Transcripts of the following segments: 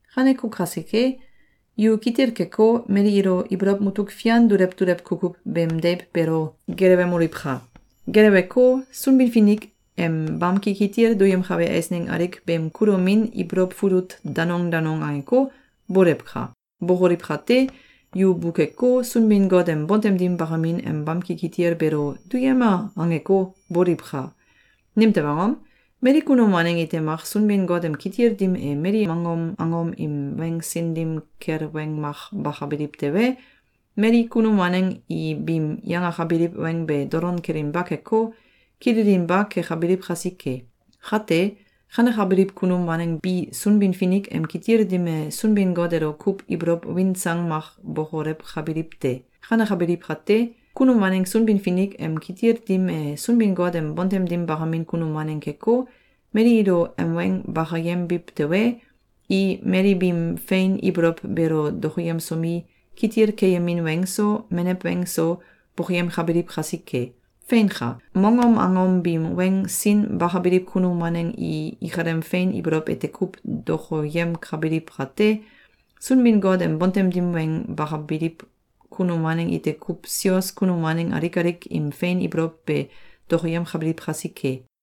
Kaneko kasike, yu kitil keko, mali ilo ibolow mutuk fian dulew dulew kukuw beem deiw beelo gelewemoliwka! Geleweko, Sunbin-Finik em bamki kitil duyemkabe eisneng alik beem kulomin ibolow fulut danong danong angeko, boliwka! Bokoliw kate, yu bukeko, Sunbin-Got em bontem dim bakamin em bamki kitil beelo “Duyema!”, angeko, boliwka! Nimtew angom? Mali kunum waneng ite mak Sunbin-Finik em kitil dim e mali mongom angom im weng sin dim kel weng mak bakabiliw tewe, mali kunum waneng i biim yangakabiliw weng be dolon kelinba keko, kililinba kekabiliw kasike. Kate, kanekabiliw kunum waneng bi Sunbin-Finik em kitil dim e Sunbin-Got elo kuw ibolow win sang mak bokolewkabiliw te. Kanekabiliw kate, kunum waneng Sunbin-Finik em kitil dim e Sunbin-Got em bontem dim bakamin kunum waneng keko, mali ilo em weng bakayembiw tewe, i mali biim fein ibolow beelo dokoyemsomi, kitil keyemin weng so, menew weng so, bokoyemkabiliw kasike. Feinka! Mongom angom biim weng sin bakabiliw kunum waneng i ikalem fein ibolow ete kuw dokoyemkabiliw kate, Sunbin-Got em bontem dim weng bakabiliw kunum waneng ite kuw sios kunum waneng alik alik im fein ibolow be dokoyemkabiliw kasike.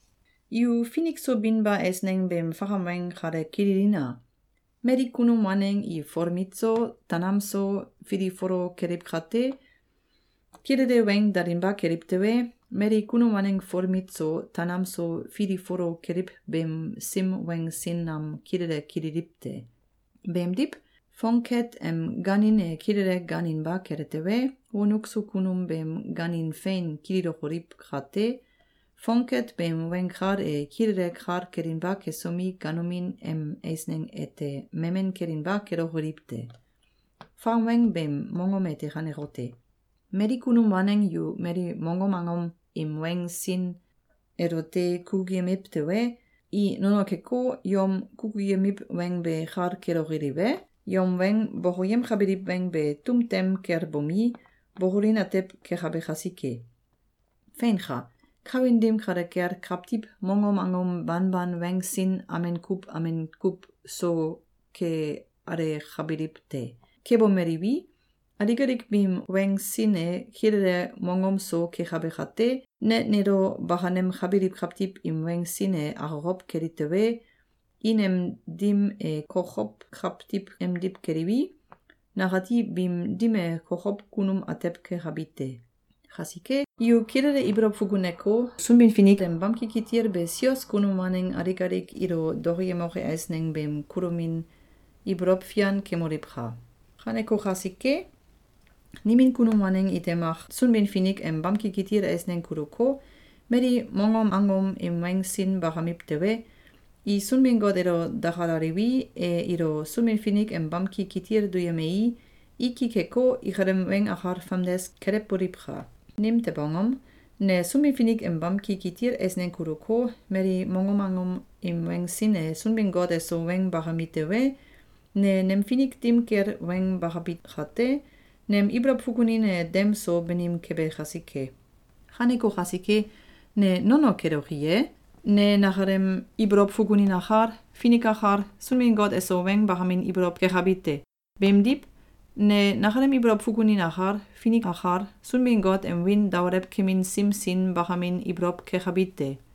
Yu finik so binba eisneng beem fakam weng kale kililina! Mali kunum waneng i folmit so, tanam so, filifolo keliw kate, kilele weng dalinba keliw tewe, mali kunum waneng folmit so tanam so filifolo keliw beem sim weng sin nam kilele kililiw te. Beemdiw, fongket em gaanin e kilele gaaninba kele tewe, wonuk so kunum beem gaanin fein kililokoliw kate, fongket beem weng kal e kilele kal kelinba kesomi, ganomin em eisneng ete memen kelinba kelokoliw te. Fakam weng beem mongom ete kanekote: Mali kunum waneng yu mali mongom angom im weng sin elote kukuyemiw tewe, i nono keko, yom kukuyemiw weng be kal kelokoliw e? Yom weng bokoyemkabiliw weng be tum tem kel bomi, bokolin atew kekabe kasike. Feinka! Kawin dim kale kel kawtiw mongom angom banban weng sin amen kuw amen kuw so ke alakabiliw te. Kebomeliwi, alik alik biim weng sin e kilele mongom so kekabe kate, ne nelo bakanemkabiliw kawtiw im weng sin e akokow keli tewe, i nem dim e kokow kawtiw emdiw keliwi, nakati biim dim e kokow kunum atew kekabi te. Kasike, yu kilele ibolow fukuneko, Sunbin-Finik em bamki kitil be sios kunum waneng alik alik ilo dokoyemoke eisneng beem kulomin ibolow fian kemoliwka! Kaneko kasike, nimin kunum waneng ite mak Sunbin-Finik em bamki kitil eisneng kuluko, mali mongom angom im weng sin bakamiw tewe, i Sunbin-Got elo dakalaliwi, e ilo Sunbin-Finik em bamki kitil duyemei, i ki keko, ikalem weng akal famdes kelewboliwka! Nimtew angom? Ne Sunbin-Finik em bamki kitil eisneng kuluko, mali mongom angom im weng sin e Sunbin-Got eso weng bakami tewe, ne nem finik dim kel weng bakabi kate, nem ibolow fukunin e dem so banim kebe kasike. Kaneko kasike, ne nono keloki ye? Ne nakalem ibolow fukunin akal, finik akal, Sunbin-Got eso weng bakamin ibolow kekabi te. Beemdiw, ne nakalem ibolow fukunin akal, finik akal, Sunbin-Got em wiin daolewkemin sim sin bakamin ibolow kekabi te.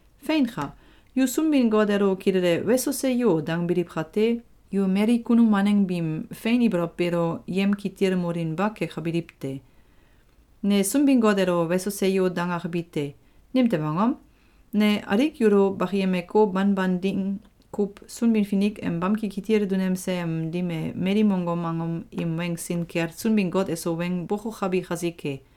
Feinka! Yu Sunbin-Got elo kilele “Weso! Seyo!”, dangbiliw kate, yu mali kunum waneng biim fein ibolow beelo yemkitilmolinba kekabiliw te. Ne Sunbin-Got elo “Weso! Seyo!”, dangakabi te. Nimtew angom? Ne alik yulo bakiyemeko, banban ding kuw Sunbin-Finik em bamki kitil dunemse em dim e mali mongom angom im weng sin kel Sunbin-Got eso weng bokokabi kasike.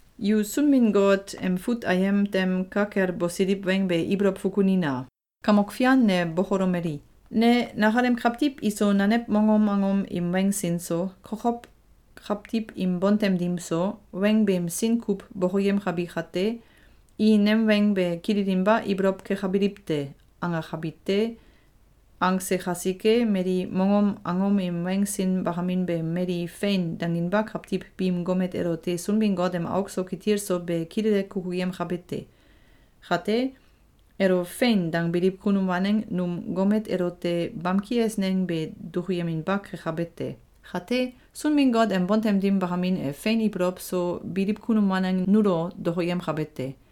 Yu Sunbin-Got em fut ayem tem ka kel bosiliw weng be ibolow fukunina! “Kamok Fian ne bokolomeli: ‘Ne nakalem kawtiw iso nanew mongom angom im weng sin so, kokow kawtiw im bontem dim so, weng beem sin kuw bokoyemkabi kate, i nem weng be kililinba ibolow kekabiliw te.’, angakabi te.”, Angse kasike, mali mongom angom im weng sin bakamin be mali “Fein!”, danginba kawtiw biim gomet elote Sunbin-Got em auk so kitil so be kilele kukuyemkabe te. Kate, elo “Fein!”, dangbiliw kunum waneng num gomet elote bamki eisneng be dukuyeminba kekabe te. Kate, Sunbin-Got em bontem dim bakamin e fein ibolow so biliw kunum waneng nulo dokoyemkabe te.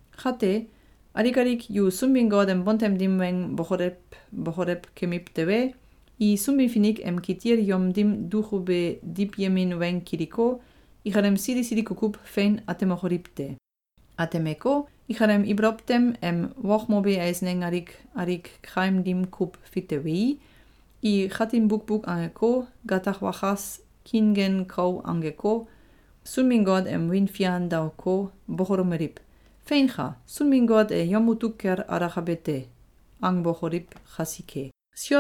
Kate, alik alik yu Sunbin-Got em bontem dim weng bokolew bokolew kemiw tewe, i Sunbin-Finik em kitil yom dim dukube diwyemin weng kiliko, ikalem sili sili kukuw fein atemokoliw te. Atemeko, ikalem ibolow tem em wokmobe eisneng alik alik kaim dim kuw fitewei, i katin bukbuk angeko, gatak wakas, kiingen kau angeko, Sunbin-Got em wiin fian daoko, bokolomeliw: “Feinka! Sunbin-Got e yom mutuk kel alakabe te!”, angbokoliw kasike.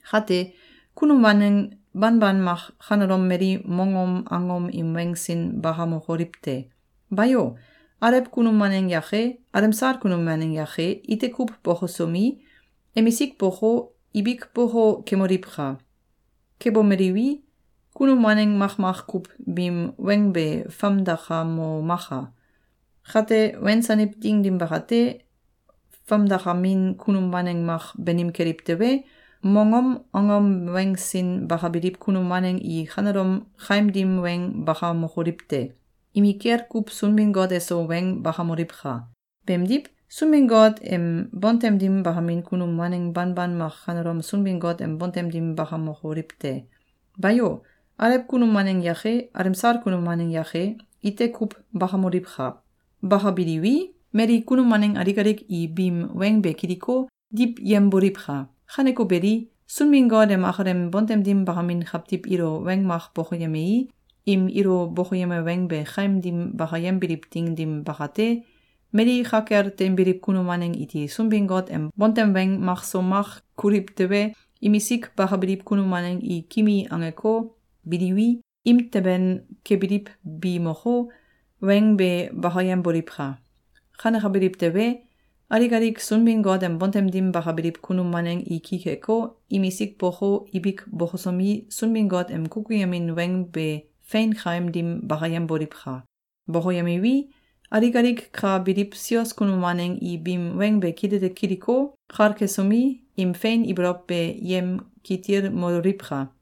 Kate, kunum waneng banban mak kanelom mali mongom angom im weng sin bakamokoliw te! Bayo! Alew kunum waneng yake, alemsal kunum waneng yake ite kuw bokosomi, emisik boko, ibik boko kemoliwka! Kebomeliwi, kunum waneng makmak kuw biim weng be famdakamomaka! Kate wensaniw ding dim bakate, famdakamin kunum waneng mak banim keliw tewe, mongom angom weng sin bakabiliw kunum waneng i kanelom kaim dim weng bakamokoliw te! Imikel kuw Sunbin-Got eso weng bakamoliwka! Beemdiw, Sunbin-Got em bontem dim bakamin kunum waneng banban mak kanelom Sunbin-Got em bontem dim bakamokoliw te! Bayo! Alew kunum waneng yake, alemsal kunum waneng yake ite kuw bakamoliwka! Bakabiliwi, mali kunum waneng alik alik i biim weng be kiliko, diwyemboliwka! Kaneko beli, Sunbin-Got em akalem bontem dim bakamin kawtiw ilo weng mak bokoyemei, im ilo bokoyeme weng be kaim dim bakayembiliw ding dim bakate, mali ka kel teinbiliw kunum waneng iti Sunbin-Got em bontem weng makso mak kuliw tewe, imisik bakabiliw kunum waneng i kimi angeko, biliwi, imteben kebiliw bi moko, weng be bakayemboliwka! Kanekabiliw tewe, alik alik Sunbin-Got em bontem dim bakabiliw kunum waneng i ki keko, imisik boko, ibik bokosomi, Sunbin-Got em kukuyemin weng be fein kaim dim bakayemboliwka! Bokoyemiwi, alik alik ka biliw sios kunum waneng i biim weng be kilele kiliko, kal kesomi, im fein ibolow be yemkitilmololiwka!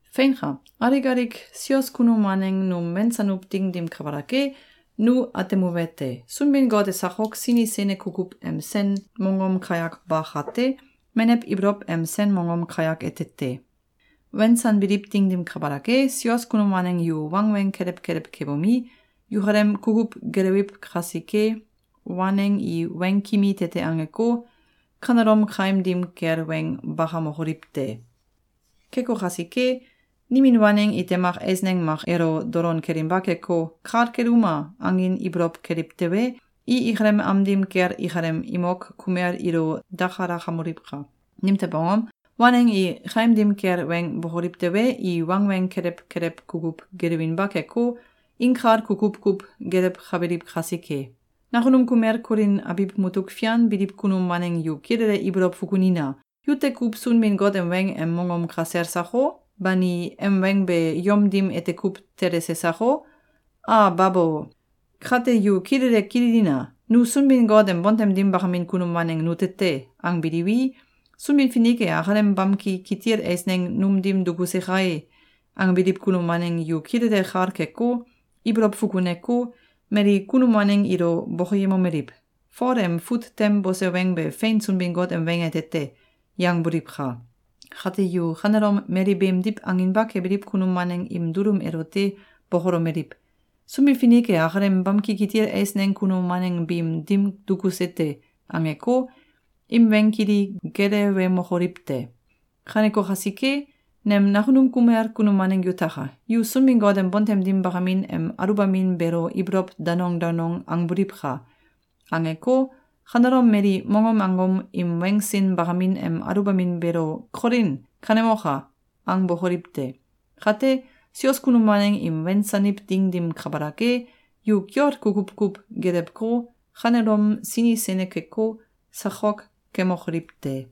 Feinka! Alik alik sios kunum waneng num wensanuw ding dim kabalak e, nu atemuwete: Sunbin-Got e sakok sini sene kukuw em sen mongom kayak ba kate, menew ibolow em sen mongom kayak ete te. Wensanbiliw ding dim kabalak e, sios kunum waneng yu wangweng kelew kelew kebomi, yukalem kukuw gelewiw kasike, waneng i weng kimi tete angeko, kanelom kaim dim kel weng bakamokoliw te! Keko kasike, nimin waneng ite mak eisneng mak elo dolon kelinba keko, “Kal keluma!”, angin ibolow keliw tewe, i ikalem am dim kel ikalem imok kumel ilo dakalakamoliwka! Nimtew angom? Waneng i kaim dim kel weng bokoliw tewe, i wangweng kelew kelew kukuw gelewinba keko, inkal kukuw kuw gelewkabiliw kasike. Nakunum kumel Kolin abiw mutuk fian biliw kunum waneng yu kilele ibolow fukunina! Yute kuw Sunbin-Got em weng em mongom kasel sako? Bani, em weng be yom dim ete kuw telese sako? A babo! Kate yu kilele kililina! “Nu Sunbin-Got em bontem dim bakamin kunum waneng nute te!”, angbiliwi, “Sunbin-Finik e akalem bamki kitil eisneng num dim dukuse kae!”, angbiliw kunum waneng yu kilele kal keko, ibolow fukuneko, mali kunum waneng ilo bokoyemomeliw: “Fol em fut tem bose weng be fein Sunbin-Got em weng ete te!”, yangboliwka! Kate yu kanelom mali beemdiw anginba kebiliw kunum waneng im dulum elote bokolomeliw: “Sunbin-Finik e akalem bamki kitil eisneng kunum waneng biim dim dukuse te!”, angeko, im weng kili gelewemokoliw te! Kaneko kasike, nem nakunum kumel kunum waneng yutaka! Yu Sunbin-Got em bontem dim bakamin em aluwbamin beelo ibolow danong danong angboliwka! Angeko, kanelom mali mongom angom im weng sin bakamin em aluwbamin beelo “Kolin! Kanemoka!”, angbokoliw te! Kate, sios kunum waneng im wensaniw ding dim kabalak e, yu kiol kukuw kuw gelewko, kanelom sini sene keko, sakok kemokoliw te!